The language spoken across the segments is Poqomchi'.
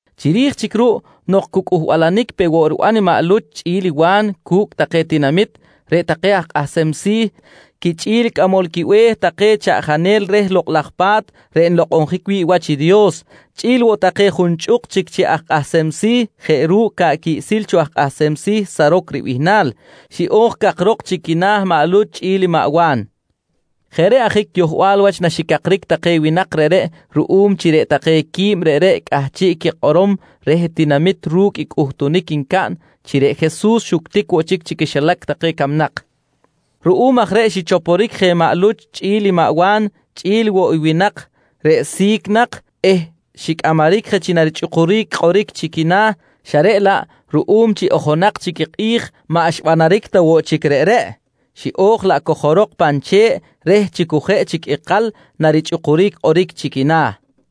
Chiri̱j chic ruꞌ nok cu cꞌuhbalanic pe woꞌ riban maꞌ Luch chꞌi̱l i Wa̱n cu̱cꞌ take tinamit, reꞌ take aj kꞌahsem si̱ quichꞌi̱l i cꞌamol quibe̱h take chaꞌjanel reh Lokꞌ laj Pa̱t reꞌ nlokꞌonjic wi̱ꞌ wach i Dios, chꞌi̱l woꞌ take junchꞌuk chic chi aj kꞌahsem si̱ jeꞌ ru̱cꞌ ca̱ꞌ quiꞌsil cho aj kꞌahsem si̱ Saroc ribihnal, xiꞌo̱j cakrok chi quina̱ maꞌ Luch chꞌi̱l i maꞌ Wa̱n. Jeꞌ reꞌ ajic yohbal wach naxicakric take winak reꞌreꞌ ruꞌum chi reꞌ take qui̱b reꞌreꞌ cꞌahchiꞌ quikꞌorom reh tinamit ru̱cꞌ i cꞌuhtunic ncaꞌn, chi reꞌ Jesus xuctic woꞌ chic chi quixilac take camnak. Ruꞌum aj reꞌ xichoporic je maꞌ Luch chꞌi̱l i maꞌ Wa̱n chꞌi̱l woꞌ i winak reꞌ si̱c nak eh xicꞌamaric je chi narichꞌukuric kꞌoric chi quina̱ xa reꞌ laꞌ ruꞌum chi ojonak chic i kꞌi̱j maꞌ xbanaric ta woꞌ chic reꞌreꞌ, xiꞌo̱j laꞌ cojorok pan che̱ꞌ reh chi cu jeꞌ chic ikal narichꞌukuric kꞌoric chi quina̱.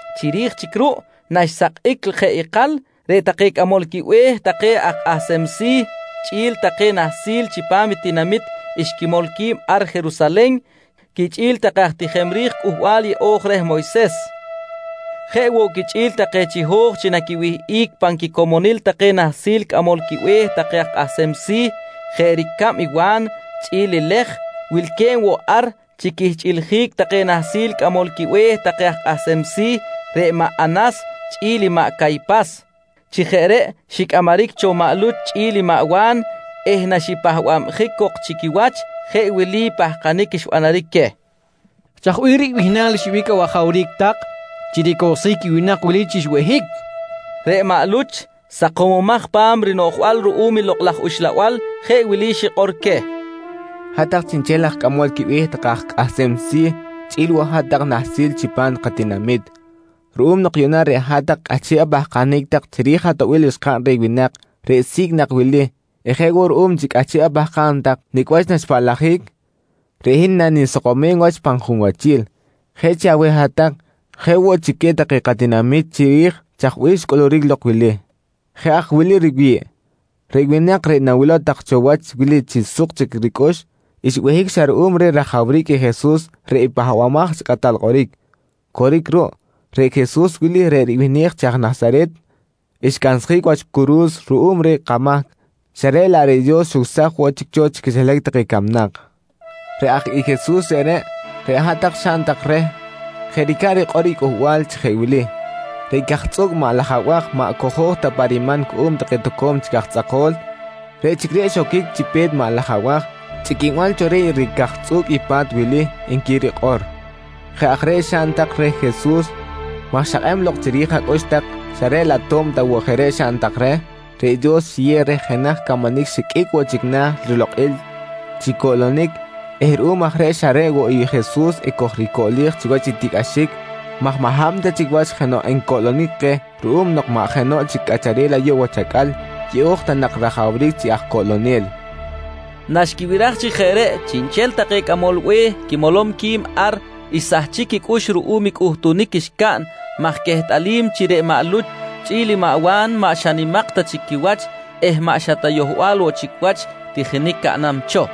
Chiri̱j chic ruꞌ naxsakꞌic jeꞌ ikal, reꞌ take cꞌamol quibe̱h take aj kꞌahsem si̱ quichꞌi̱l take nahsil chipam tinamit xquimol qui̱b ar Jerusalen quichꞌi̱l take aj tijem ri̱j Cꞌuhbal Yeꞌo̱j reh Moyses. Jeꞌ woꞌ quichꞌi̱l take chiho̱j chi naquiwihꞌic pan quicomonil take nahsil cꞌamol quibe̱h take aj kꞌahsem si̱ jeꞌ ricab i Wa̱n chꞌi̱l i Lej, wilque̱b woꞌ ar chi quihchꞌiljic take nahsil cꞌamol quibe̱h take aj kꞌahsem si̱ reꞌ maꞌ Anas chꞌi̱l maꞌ Caypas. Chi jeꞌ reꞌ xicꞌamaric cho maꞌ Luch chꞌi̱l i Wa̱n eh naxipahbabjic cok chi quiwach, jeꞌ wili pahkanic xbanaric queh: «Chaj bih ribihnal xyeꞌbic awajawric tak chi ricowsjic i winak wili chi xbehic? nqui take. Reꞌ maꞌ Luch, sakomomaj pa̱m rinoꞌjbal ruꞌum Lokꞌ laj Uxlabal, jeꞌ wili xikꞌor queh: «Hat-tak chiꞌnchel aj cꞌamol quibe̱h take aj kꞌahsem si̱ chꞌi̱l woꞌ hat-tak nahsil chipam katinami̱t, ruꞌum nok yuꞌna reꞌ hat-tak cꞌahchiꞌ apahkanic tak chiri̱j atoꞌbil xkaꞌn reh winak reꞌ si̱c nak wili eh jeꞌ woꞌ ruꞌum chi cꞌahchiꞌ apahkam tak nicꞌ wach naxpaꞌlajic, reꞌ hin nanisakomem wach pan junwachil, jeꞌ chi aweh hat-tak jeꞌ woꞌ chi queh take katinami̱t chiri̱j chaj bih xcꞌuluric lok wili. Jeꞌ aj wili riwi̱ꞌ: Reꞌ winak reꞌ nawilow tak cho wach wili chi suk chic ricꞌux, xbehic xa ruꞌum reh rajawric i Jesus reꞌ Pahbamaj chi Kꞌatal Kꞌoric. Coric ruꞌ, reꞌ Jesus wili reꞌ ribihnej chi aj Nasaret, xcansjic wach curu̱s ruꞌum reh kamahc xa reꞌ laꞌ reꞌ Dios xucsaj woꞌ chic cho chi quixilac take camnak. Reꞌ aj i Jesus reꞌreꞌ, reꞌ hat-tak xaꞌn tak reh jeꞌ ricab rikꞌor i Cꞌuhbal chi jeꞌ wili: “Reꞌ cajtzꞌuꞌc maꞌ laj abaj maꞌ cojo̱j ta pa riman cuꞌum take toco̱m chic aj tzꞌako̱l, reꞌ chic reꞌ xoquic chi pe̱t maꞌ laj abaj chꞌiquinbal cho reh ricajtzꞌuꞌc i pa̱t wili, nqui rikꞌor. «Jeꞌ aj reꞌ xaꞌn tak reh Jesus maj xakꞌeꞌb lok chiri̱j acꞌux tak xa reꞌ laꞌ to̱b ta woꞌ jeꞌ reꞌ xaꞌn tak reh, reꞌ Dios xiyew reh jenaj camanic xiqꞌuic woꞌ chic na̱ rilokꞌil chi coꞌlonic eh ruꞌum aj reꞌ xa reꞌ woꞌ i Jesus ekojricoꞌlej chiwach i tiꞌcꞌaxic maj maꞌ hab ta chic wach jenoꞌ encoꞌlonic keh ruꞌum nok maꞌ jenoꞌ chic cꞌacharel ayuꞌ wach acꞌal yeꞌo̱j ta nak rajawric chi aj coꞌlonel, nqui maꞌ Luch. Naxquibiraj chi jeꞌ reꞌ, chiꞌnchel take cꞌamol be̱h quimolom qui̱b ar xsahchic quicꞌux ruꞌum i cꞌuhtunic ncaꞌn maj quehtꞌalim chi reꞌ maꞌ Luch chꞌi̱l i Wa̱n maꞌ xa nimak ta chic quiwach eh maꞌ xa yohbal ta woꞌ chic wach tijinic caꞌnam cho,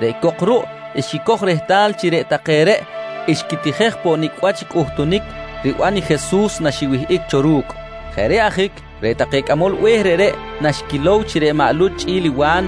reꞌ cok ruꞌ xquicoj rehtal chi reꞌ take reꞌ xquitijej poꞌ nicꞌ wach i cꞌuhtunic riban i Jesus naxiwihꞌic cho cu̱cꞌ. Jeꞌ reꞌ ajic reꞌ take cꞌamol be̱h reꞌreꞌ naxquilow chi reꞌ maꞌ Luch chꞌi̱l i Wa̱n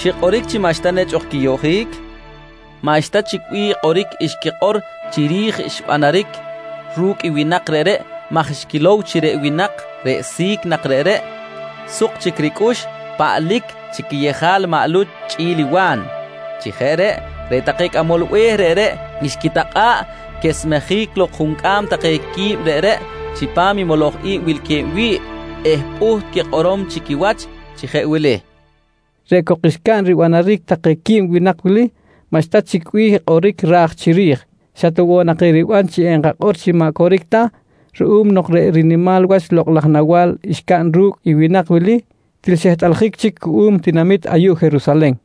xikꞌoric chi maꞌxta nechꞌ ok quiyoꞌjic, maꞌxta chic bih kꞌoric xquikꞌor chiri̱j xbanaric ru̱cꞌ winak reꞌreꞌ maj xquilow chi reꞌ winak reꞌ si̱c nak reꞌreꞌ, suk chic ricꞌux paꞌlic chi quiyejal maꞌ Luch richꞌi̱l i Wa̱n. Chi jeꞌ reꞌ, reꞌ take cꞌamol be̱h reꞌreꞌ xquitakꞌa̱ꞌ quesmejic lok juncꞌam take qui̱b reꞌreꞌ chipam i moloj i̱b wilque̱b wi̱ꞌ eh pꞌuht quikꞌorom chi quiwach chi jeꞌ wili: «Reꞌ cok xcaꞌn ribanaric take qui̱b winak wili maꞌxta chic bih kꞌoric ra̱j chiri̱j. Xa ta woꞌ nak eriban chi enkakꞌor chi maꞌ coric ta ruꞌum nok reꞌ rinimal wach lokꞌ laj nawa̱l xcaꞌn ru̱cꞌ i winak wili til xehtꞌaljic chic cuꞌum tinamit ayuꞌ Jerusalen.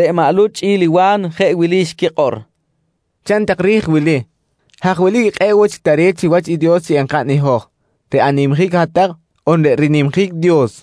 Reꞌ maꞌ Luch chꞌi̱l i Wa̱n jeꞌ wili xquikꞌor: «Chaꞌn tak ri̱j i wili: Haj wilic i kꞌe̱ꞌ woꞌ chic tare̱t chiwach i Dios chi enkaꞌn i hoj, reꞌ animjic hat-tak on reꞌ rinimjic Dios?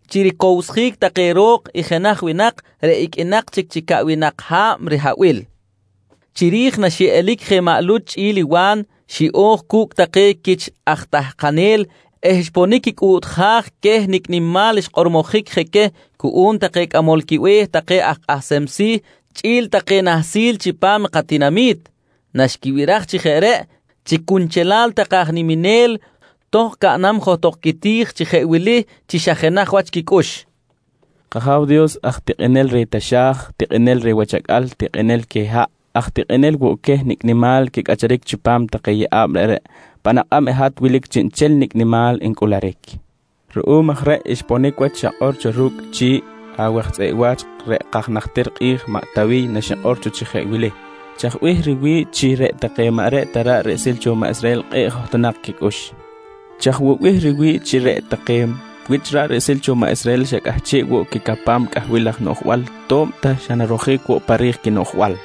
chi ricowsjic take ro̱k i jenaj winak reꞌ iqꞌuinak chic chi caꞌwinak ha̱b rihabil. Chiri̱j naxiꞌelic je maꞌ Luch chꞌi̱l i Wa̱n, xiꞌo̱j cu̱cꞌ take quich aj tahkanel eh xponic quicꞌuꞌtjaj queh nicꞌ nimal xkꞌormojic je queh cuꞌum take cꞌamol quibe̱h take aj kꞌahsem si̱ chꞌi̱l take nahsil chipam katinami̱t. Naxquibiraj chi jeꞌ reꞌ, chi cunchelal take aj niminel tohkꞌ caꞌnam johtok quiti̱j chi jeꞌ wili chi xa jenaj wach quicꞌux: «K-Aja̱w Dios aj tikꞌinel reh taxa̱j, tikꞌinel reh wach acꞌal, tikꞌinel queh haꞌ, aj tikꞌinel woꞌ queh nicꞌ nimal quicꞌacharic chipam take yeꞌa̱b reꞌreꞌ, pan akꞌab i hat wilic chiꞌnchel nicꞌ nimal ncꞌuluric. Ruꞌum aj reꞌ xponic wach i xakꞌor cho ru̱cꞌ chi̱ꞌ awaj tzꞌeꞌ wa̱ch reꞌ kaj najtir kꞌi̱j maꞌ Tawiy naxikꞌor cho chi jeꞌ wili: “Chaj bih riwi̱ꞌ chi reꞌ take maꞌ reꞌ ta ra̱ꞌ riꞌsil cho maꞌ Israhel kꞌe̱ꞌ johtonak quicꞌux? Chaj woꞌ bih riwi̱ꞌ chi reꞌ take wich ra̱ꞌ riꞌsil cho maꞌ Israhel xa cꞌahchiꞌ woꞌ quicapam cꞌahbil laj noꞌjbal to̱b ta xa narojic woꞌ pa ri̱j quinoꞌjbal?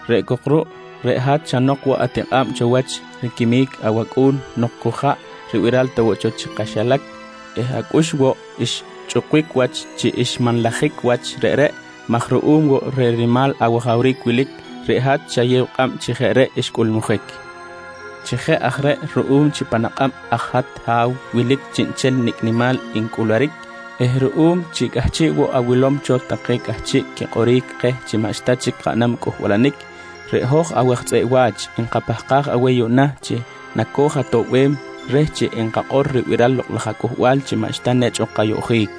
Reꞌ cok ruꞌ reꞌ hat xa nok woꞌ atikꞌa̱b cho wach riquimic awAcꞌu̱n nok cu jaꞌ ribiral ta woꞌ cho chi kaxilac eh acꞌux woꞌ xchꞌukbic wach chi xmanlajic wach reꞌreꞌ maj ruꞌum woꞌ reh rinimal awajawric wilic, reꞌ hat xayew kꞌab chi jeꞌ reꞌ xcꞌulmujic. Chi jeꞌ aj reꞌ ruꞌum chi pan akꞌab aj i hat Ha̱w wilic chiꞌnchel nicꞌ nimal ncꞌuluric eh ruꞌum chi cꞌahchiꞌ woꞌ awilom cho take cꞌahchiꞌ quikꞌoric keh chi maꞌxta chic kaꞌnam cꞌuhbalanic, reꞌ hoj awaj tzꞌeꞌ wa̱ch nkapahkaj aweh yuꞌna chi nakoj-atoꞌbem reh chi enkakꞌor ribiral i Lokꞌ laj aCꞌuhbal chi maꞌxta nechꞌ ok kayoꞌjic.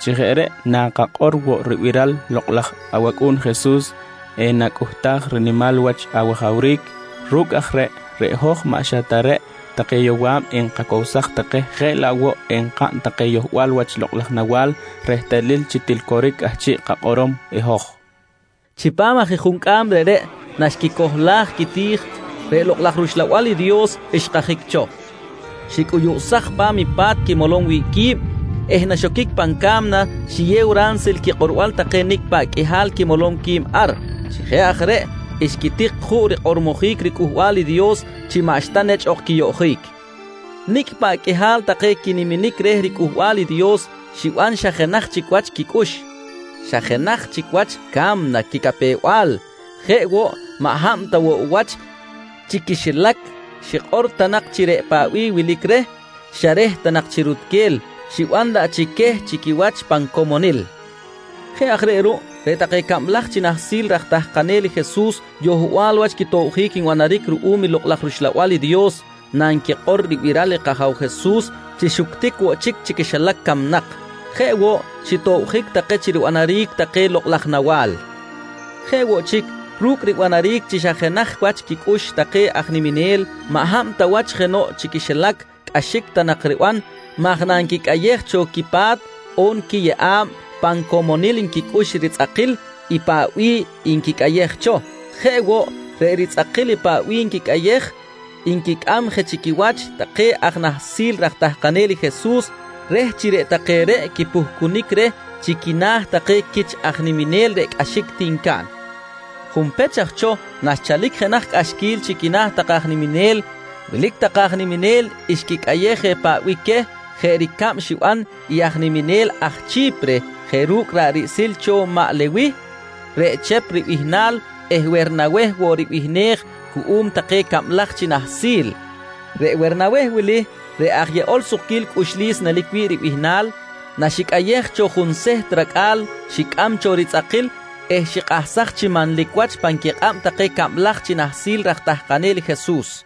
Chi jeꞌ reꞌ nakakꞌor woꞌ ribiral i lokꞌ laj awAcꞌu̱n Jesus, enacꞌuhtaj i rinimal wach awajawric. Ru̱cꞌ aj reꞌ, reꞌ hoj maꞌ xa ta reꞌ take yowa̱b enkacowsaj take jeꞌ laꞌ woꞌ enkaꞌn take yohbal wach lokꞌ laj nawa̱l rehtalil chi til coric i cꞌahchiꞌ kakꞌorom i hoj, nqui take johtok pan quiti̱j. Chipam aj i juncꞌam reꞌreꞌ naxquicohlaj quiti̱j, reꞌ Lokꞌ laj rUxlabal i Dios xkajic cho, xicꞌuyuꞌsaj pa̱m i pa̱t quimolom wi̱ꞌ qui̱b eh naxoquic pan ca̱mna xiyew ransil quikꞌorbal take nicꞌ paꞌ qꞌuihal quimolom qui̱b ar. Chi jeꞌ aj reꞌ xquitik juꞌ rikꞌormojic riCꞌuhbal i Dios chi maꞌxta nechꞌ ok quiyoꞌjic. Nicꞌ paꞌ qꞌuihal take quiniminic reh riCꞌuhbal i Dios xiban xa jenaj chic wach quicꞌux, xa jenaj chic wach ca̱mna quicapew-bal. Jeꞌ woꞌ, maꞌ hab ta woꞌ wach chi quixilac xikꞌor ta nak chi reꞌ paꞌ bih wilic reh, xa reh ta nak chi rutquel, xiban laꞌ chi queh chi quiwach pan comonil. Jeꞌ aj reꞌ ruꞌ, reꞌ take cablaj chi nahsil raj tahkanel i Jesus yohbal wach quitobjic nbanaric ruꞌum Lokꞌ laj rUxlabal i Dios nanquikꞌor ribiral i kAja̱w Jesus chi xuctic woꞌ chic chi quixilac camnak, jeꞌ woꞌ xitobjic take chi ribanaric take lokꞌ laj nawa̱l. Jeꞌ woꞌ chic, ru̱cꞌ ribanaric chi xa jenaj wach quicꞌux take aj niminel, maꞌ hab ta wach jenoꞌ chi quixilac cꞌaxic ta nak riban maj nanquicꞌayej cho quipa̱t on quiyeꞌa̱b, pan comonil nquicꞌux i ritzꞌakil i paꞌ bih nquicꞌayej cho. Jeꞌ woꞌ, reꞌ ritzꞌakil i paꞌ bih nquicꞌayej, nquicꞌam je chi quiwach take aj nahsil raj tahkanel i Jesus reh chi reꞌ take reꞌ quipuhcunic reh chi quina̱ take quich aj niminel reꞌ cꞌaxic ti ncaꞌn. Junpech aj cho naxchalic jenaj cꞌaxquil chi quina̱ take aj niminel, wilic take aj niminel xquicꞌayej je paꞌ bih queh jeꞌ ricab xiban aj niminel aj Chi̱pire jeꞌ ru̱cꞌ ra̱ꞌ riꞌsil cho maꞌ Lewih reꞌ Chep ribihnal eh Wernaweh woꞌ ribihnej cuꞌum take cablaj chi nahsil. Reꞌ Wernaweh wili reꞌ “aj yeꞌol sukquil cꞌuxlis” nelic wi̱ꞌ ribihnal, naxicꞌayej cho junseht racꞌa̱l, xicꞌam cho ritzꞌakil eh xikꞌahsaj chi manlic wach pan quikꞌab take cablaj chi nahsil raj tahkanel i Jesus.